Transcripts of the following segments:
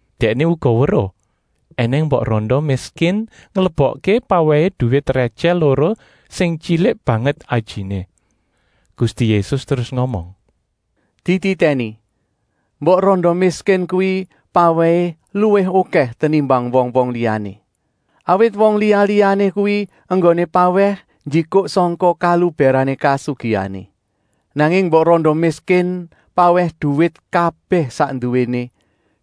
Dèkné uga weruh ènèng mbok randa miskin nglebokké pawèhé duwit rètyèh loro sing tyilik banget ajiné. Gusti Yésus terus ngomong: “Dititèni! Mbok randa miskin kuwi pawèhé luwih okèh tenimbang wong-wong liyané. Awit wong liya-liyané kuwi enggoné pawèh njikuk sangka kalubèrané kasugihané. Nanging mbok randa miskin pawèh duwit kabèh sak nduwéné,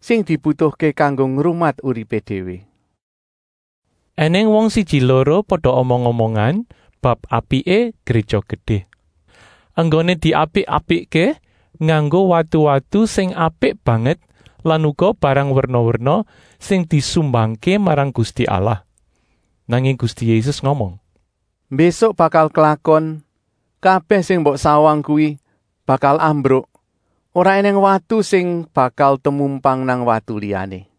sing dibutuhké kanggo ngrumat uripé déwé.” Enèng wong siji-loro pada omong-omongan bab apiké Gréja Gedé, enggoné diapik-apikké nganggo watu-watu sing apik banget lan uga barang werna-werna sing disumbangké marang Gusti Allah. Nanging Gusti Yésus ngomong: “Mbésuk bakal klakon, kabèh sing mbok sawang kuwi bakal ambruk, ora ènèng watu sing bakal temumpang nang watu liyané.”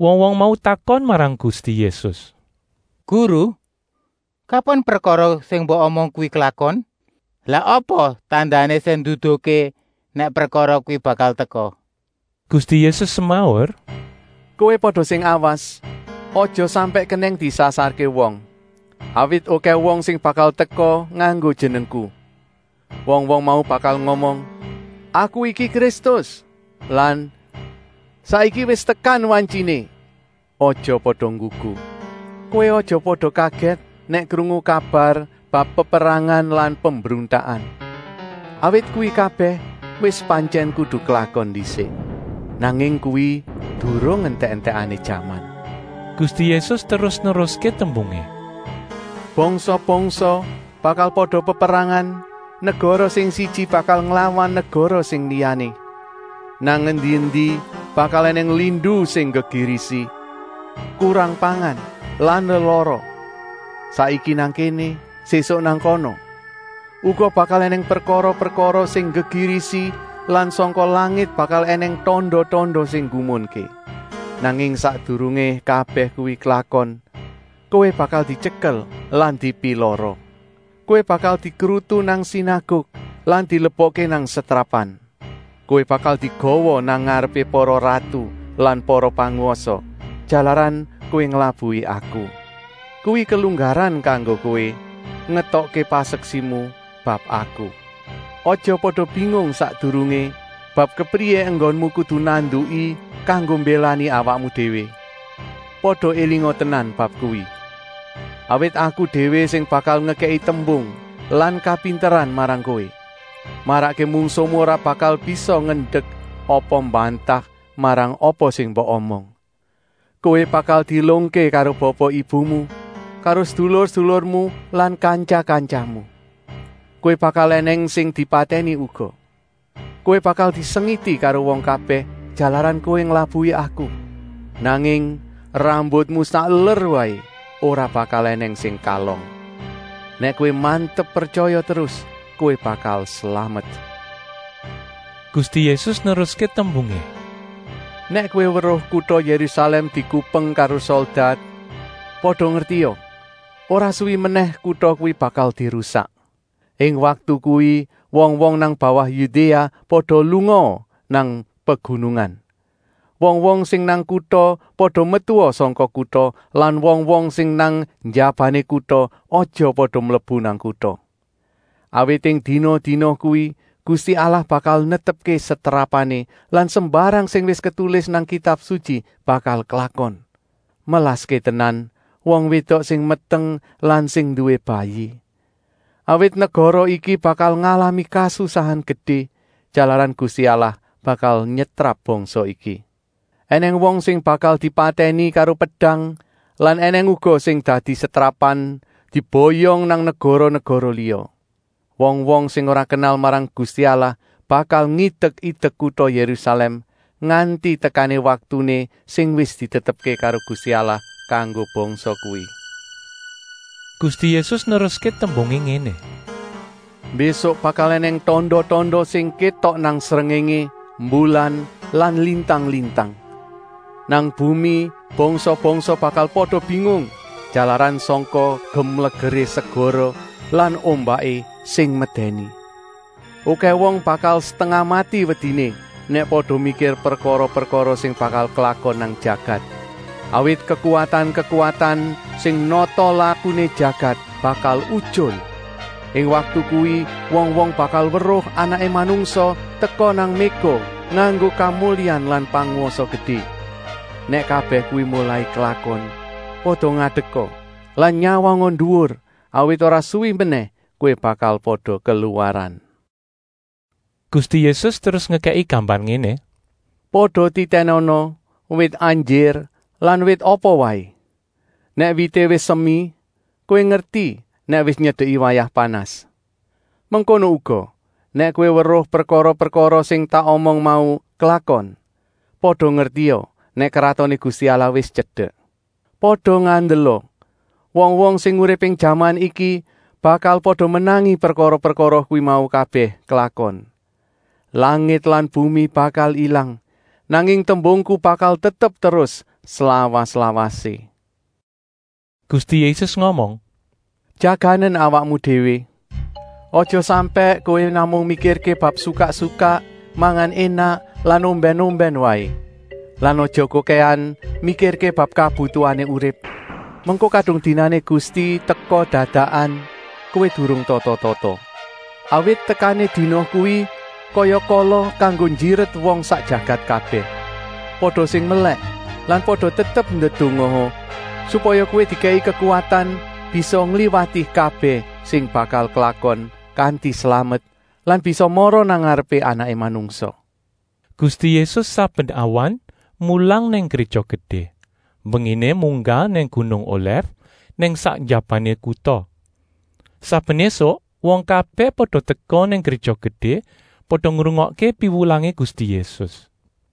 Wong-wong mau takon marang Gusti Yésus: “Guru, kapan prekara sing mbok omong kuwi klakon? Lah apa tandané sing nduduhké nèk prekara kuwi bakal teka?” Gusti Yésus semaur: “Kowé pada sing awas, aja sampèk kenèng disasarké wong. Awit okèh wong sing bakal teka nganggo Jenengku. Wong-wong mau bakal ngomong: ‘Aku iki Kristus!’ lan ‘Saiki wis tekan wantyiné!’ Aja pada nggugu! Kowé aja pada kagèt nèk krungu kabar bab peperangan lan pembruntakan. Awit kuwi kabèh wis pantyèn kudu klakon ndisik. Nanging kuwi durung entèk-entèkané jaman.” Gusti Yésus terus neruské tembungé: “Bangsa-bangsa bakal pada peperangan, negara sing siji bakal nglawan negara sing liyané. Nang endi-endi bakal ènèng lindu sing nggegirisi, kurang pangan lan lelara, saiki nang kéné, sésuk nang kana. Uga bakal ènèng prekara-prekara sing nggegirisi lan sangka langit bakal ènèng tanda-tanda sing nggumunké. Nanging sakdurungé kabèh kuwi klakon, kowé bakal dityekel lan dipilara. Kowé bakal dikrutu nang sinaguk lan dilebokké nang setrapan. Kowé bakal digawa nang ngarepé para ratu lan para pangwasa, jalaran kowé nglabuhi Aku. Kuwi kelunggaran kanggo kowé ngetokké paseksimu bab Aku. Aja pada bingung sakdurungé bab kepriyé enggonmu kudu nanduki kanggo mbélani awakmu déwé. Pada élinga tenan bab kuwi. Awit Aku déwé sing bakal ngekèki tembung lan kapinteran marang kowé, marakké mungsuhmu ora bakal bisa ngendek apa mbantah marang apa sing mbok omong. Kowé bakal dielungké karo bapa-ibumu, karo sedulur-sedulurmu lan kantya-kantyamu. Kowé bakal ènèng sing dipatèni uga. Kowé bakal disengiti karo wong kabèh, jalaran kowé nglabuhi Aku. Nanging rambutmu sakeler waé ora bakal ènèng sing kalong. Nèk kowé mantep pretyaya terus, kowé bakal slamet.” Gusti Yésus neruské tembungé: “Nèk kowé weruh kuta Yérusalèm dikupeng karo soldat, pada ngertia, ora suwi menèh kuta kuwi bakal dirusak. Ing waktu kuwi wong-wong nang bawah Yudéa pada lungaa nang pegunungan. Wong-wong sing nang kuta pada metua sangka kuta lan wong-wong sing nang njabané kuta aja pada mlebu nang kuta. Awit ing dina-dina kuwi Gusti Allah bakal netepké setrapané lan sembarang sing wis ketulis nang Kitab Sutyi bakal klakon. Melaské tenan wong wédok sing meteng lan sing nduwé bayi. Awit negara iki bakal ngalami kasusahan gedé, jalaran Gusti Allah bakal nyetrap bangsa iki. Enèng wong sing bakal dipatèni karo pedang lan ènèng uga sing dadi setrapan diboyong nang negara-negara liya. Wong-wong sing ora kenal marang Gusti Allah bakal ngidek-idek kuta Yérusalèm, nganti tekané waktuné sing wis ditetepké karo Gusti Allah kanggo bangsa kuwi.” Gusti Yésus neruské tembungé ngéné: “Mbésuk bakal ènèng tanda-tanda sing kétok nang srengéngé, mbulan lan lintang-lintang. Nang bumi bangsa-bangsa bakal pada bingung, jalaran sangka gemlegeré segara lan ombaké sing medèni. Okèh wong bakal setengah mati wediné nèk pada mikir prekara-prekara sing bakal klakon nang jagat. Awit kekuwatan-kekuwatan sing nata lakuné jagat bakal utyul. Ing waktu kuwi wong-wong bakal weruh Anaké Manungsa teka nang méga nganggo kamulyan lan pangwasa gedé. Nèk kabèh kuwi molai klakon, pada ngadeka lan nyawanga nduwur, awit ora suwi menèh kowé bakal pada keluwaran.” Gusti Yésus terus ngekèki gambar ngéné: “Pada titènana wit anjir lan wit apa waé. Nèk wité wis semi, kowé ngerti nèk wis nyedeki wayah panas. Mengkono uga, nèk kowé weruh prekara-prekara sing tak omong mau klakon, pada ngertia nèk Kratoné Gusti Allah wis tyedek. “Pada ngandela! Wong-wong sing urip ing jaman iki bakal pada menangi prekara-prekara kuwi mau kabèh klakon. Langit lan bumi bakal ilang, nanging tembungku bakal tetep terus slawas-lawasé.” Gusti Yésus ngomong: “Jaganen awakmu déwé! Aja sampèk kowé namung mikirké bab sukak-sukak, mangan énak lan ombèn-ombèn waé. Lan aja kokèhan mikirké bab kabutuhané urip, mengko kadung dinané Gusti teka dadakan, kowé durung tata-tata. Awit tekané dina kuwi kaya kala kanggo njiret wong sak jagat kabèh. Pada sing melèk lan pada tetep ndedongaa, supaya kowé dikèki kekuwatan bisa ngliwati kabèh sing bakal klakon kanti slamet lan bisa mara nang ngarepé Anaké Manungsa.” Gusti Yésus saben awan mulang nang Gréja Gedé, mbenginé munggah nang gunung Olèf nang sak njabané kuta. Saben ésuk wong kabèh pada teka nang Gréja Gedé, pada ngrungokké piwulangé Gusti Yésus.